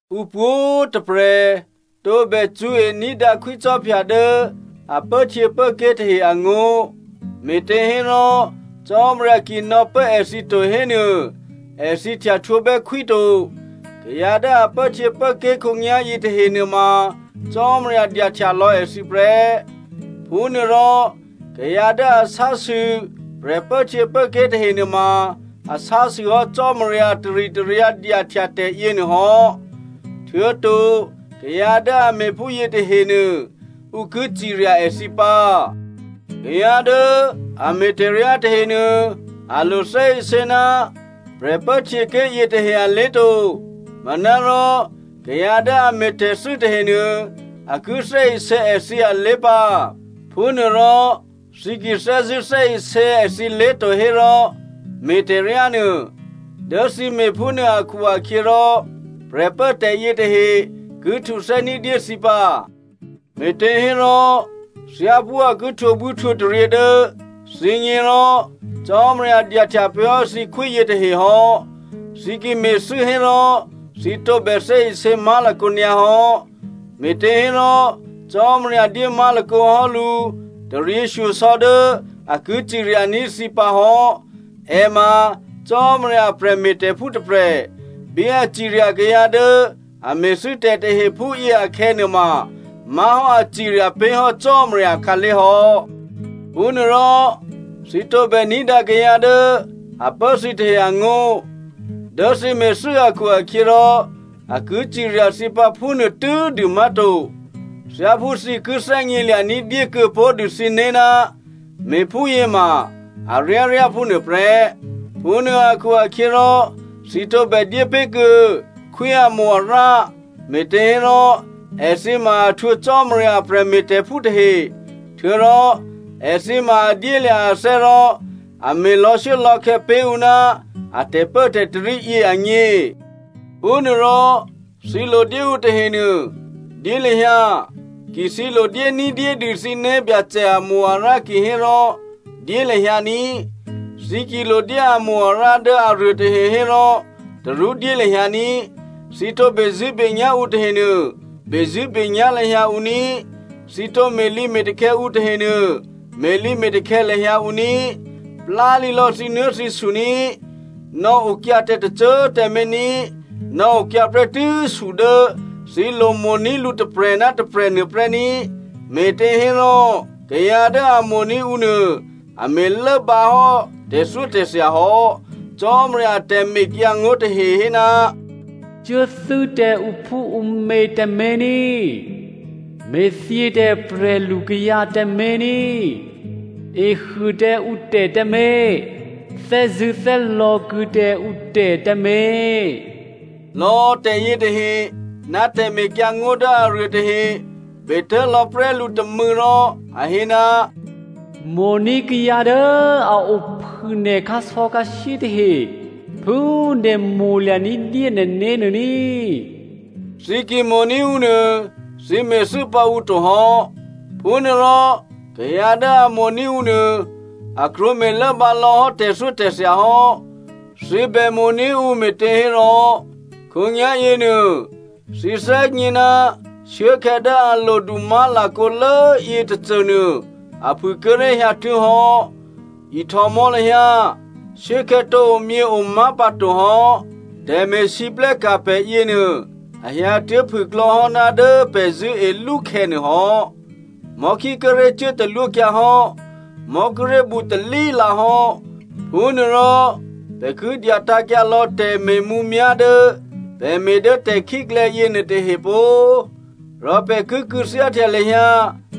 Ǔ pwǒ̤꤮ tôprè̤ tǒbè cṳ̌e ní̤dǎ khwícò́phya dố a pốhtyěké̤ tahe angó̤, me̤těhérò Cò́marya ki nò̌pố èthǐ to hénuô, èthǐ htyahtwǒbè́ khwí to. Kayǎ dố a pốhtyěpốké̤ khǒnyá̤yě tahe nuôma Cò́marya dyahtya lò̌ èthǐ prè́. Phúnuô rò, kayǎ dố a sásû prè̤pốhtyěpốké̤ tahe nuôma a sásûhò́ Cò́marya taritaryǎ dyahtya tè̤yěnuô hò́. Htuô̌to, kayǎ dố a me̤ phúyě tahenuô, ǔ ki cirya èthǐ pǎ. Kayǎ dố a me̤tè̤ryá tahenuô, a lo thè́isě ná prè̤pốhtyěké̤ yětahe alé̤ to. Manárò kayǎ dố a me̤tè̤thû́ tahenuô, a ki thè́isě èthǐ alé̤ pǎ. Phúnuôrò thǐ ki thè́zṳ̂́ thè́isě èthǐlé̤ to hérò, me̤ tè̤ryánuô, dố thǐ me̤phúnuô akhu-akhyěrò prè̤pốtè̤ yětahe ki htuthè́ ní̤dyé thǐ pǎ. Me̤těhérò, thyáphú a ki htwǒbwíhtwǒtaryě dố thǐgně rò Cò́marya dyahtya pé̤hò́ thǐkhwí yětahe hò́. Thǐ ki me̤thû́ hérò thǐ tǒbè thè́isě má̤lakǒ nyǎ hò́, me̤těhérò Cò́marya dyé má̤lakǒ hò́ lǔ taryěshyosò̌ dố a ki ciryaní̤ thǐ pǎ hò́. È ma Cò́marya a prè̤me̤tè̤phú tôprè̤. Bí a cirya kayǎ dố a me̤thû́tè̤ tahe phúyě akhè̌nuôma má̤hò́ a cirya pé̤ hò́ Cò́marya akhǎlé̤ hò́. Phúnuôrò, thǐ tǒbè ní̤dǎ kayǎ dố a pố thǐ tahe angó̤. Dố thǐ me̤thû́ akhu-akhyěrò a ki cirya thǐ pǎ phúnuô tû́dû má̤to, thyáphú thǐ ki thè́gnělya̤ ní̤dyé kuô̌ pó̤dû thǐné̤ ná me̤phúyě ma aryáryá phúnuô prè́. Phúnuô akhu-akhyěrò, thǐ tǒbè dyépé̤ kuô̌ khwí amo-arǎ, me̤těhérò èthǐ ma a htwǒ Cò́marya a prè̤me̤tè̤phú tahe. Htuô̌rò èthǐ ma a dyélya̤ athè́ rò a me̤ lò̌shuốlò̌khè̌ pé̤ ǔ ná a tè̤pốtarí yě agně. Phúnuôrò, thǐ lo dyé ǔ tahenuô, dyé lahyǎ, ki thǐ lo dyé ní̤dyédû thǐ né̤byacè amo-arǎ kihérò dyé lahyǎ ní꤮. Thǐ ki lodyé amo-arǎ dố aruô tahe hérò tarú dyé lahyǎ ní꤮. Thǐ tǒ bezṳ̂́benyá̤ ǔ tahenuô bezṳ̂́benyá̤ lahyǎ ǔ ní꤮. Thǐ tǒ me̤lǐme̤takhè̌ ǔ tahenuô me̤lǐme̤takhè̌ lahyǎ ǔ ní꤮. Plálǐlò̌ thǐnuố̤thǐsu ní꤮, nò̌okyǎ tǎ tôcô꤮ tǎmé̤ ní꤮. Nò̌okyǎ prè́tû́ su dố thǐ lo mo̤ní̤ lǔ tôprè̤ ná tôprè̤ nuôprè́ ní꤮. Me̤těhérò kayǎ dố a mo̤ní̤ ǔ nuô, a me̤ lốbǎhò́ tè̤thyótè̤thya hò́. Cò́marya a tè̤mekyǎngó̤ tahe hé, “Cuốthû́ tǎ ǔphúǔmě tǎmé̤ ní,” “Me̤thyě tǎ prè̤lu kayǎ tǎmé̤ ní,” “Ehuô tǎ ǔtè̤ tǎmé̤,” “Thè́zṳ̂́thè́lò̌ kuô̌ tǎ ǔtè̤ tǎmé̤,” lò̌ tè̤yětahe, ná tè̤mekyǎngó̤ dố aruôtahe betố̤lò̌ prè́ lǔ tômû̌ rò a hé, “Mo̤ní̤ kayǎ dố a ophû nè̤ khǎsò̌khǎshyé tahe phú nè̤ mo̤lya̤ ní̤dyé nè̤né̤ nuô ní꤮.” Thǐ ki mo̤ní̤ ǔ nuô thǐ me̤thû́ pǎ ǔ to hò́. Phúnuôrò kayǎ dố a mo̤ní̤ ǔ nuô, a krwǒ me̤lốbǎ lò̌hò́ tè̤thyótè̤thya hò́. Thǐ bè mo̤ní̤ ǔ me̤těhérò khǒnyá̤ yěnuô thǐ thè́gně ná shuốkhè̌ dố a lodu má̤lakǒlố yětôcônuô a phû꤮ kíré̤ hyǎtuố̤hò́. Ihtòmò̌ lahyǎ, shuốkhè̌ tǒ omyěo má̤pǎto hò́. Tè̤me̤lwóhteka̤ pè̤ yěnuô, a hyǎtuố̤ phûklò̌ hò́ ná dố pè̤ zṳ̂́e lú khè̌ nuôhò́. Mò̤́khí kíré̤ cuốtalwókyǎ hò́, mò̤́ kíré̤ bǔtalí lǎhò́. Phúnuôrò pè̤ ki dyatǎ̤kyǎ lò̌ tè̤me̤mǔmyá̤ dố pè̤ me̤ dố tè̤khíklè̌ yěnuôtahe pó꤮. Rò pè̤ ki kû̌thyáhtya lahyǎ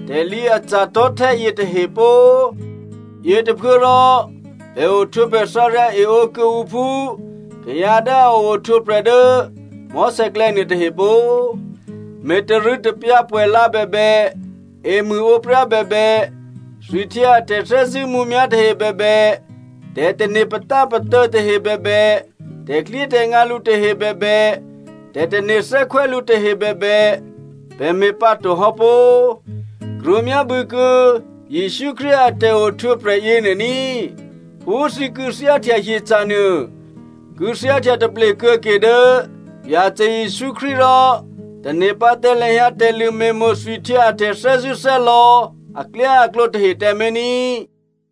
tè̤lǐ aca̤ tò̤́htè́ yětahe pó꤮. Yětôphuốrò, pè̤ ohtwǒprè̤ thǎryǎ eǒ kuô̌ǔ phú kayǎ dố a ohtwǒprè̤ dố mò̤́sè̌klè̌ nuôtahe pó꤮. Me̤ tarû̌tapyǎ pwè̌la bèbè, emṳ̂ǒpryá bèbè, thwihtyě a tè̤thè́zṳ̂́ mǔmyá̤ tahe bèbè, tè̤tane̤ patápatô̌ tahe bèbè, tè̤klyétè̤ngǎ lǔ tahe bèbè, tè̤tane̤ thè́khwè́ lǔ tahe bèbè, pè̤ me̤pǎto hò́ pó꤮. Krwǒ myábû̌kuô̌ Jesǔ Krístu a tè̤ohtwǒprè̤ yěnuô ní꤮. Phú thǐ kû̌thyáhtya hyeca̤ nuô, kû̌thyáhtya taple kuô̌ke dố Byacè Jesǔ Krístu rò tane̤ pǎ tǎ lahyǎ tè̤lṳ̂ me̤mo̤ thwihtyě a tè̤thè́zṳ̂́thè́lò̌ aklyáaklǒ tahe tǎmé̤ ní꤮.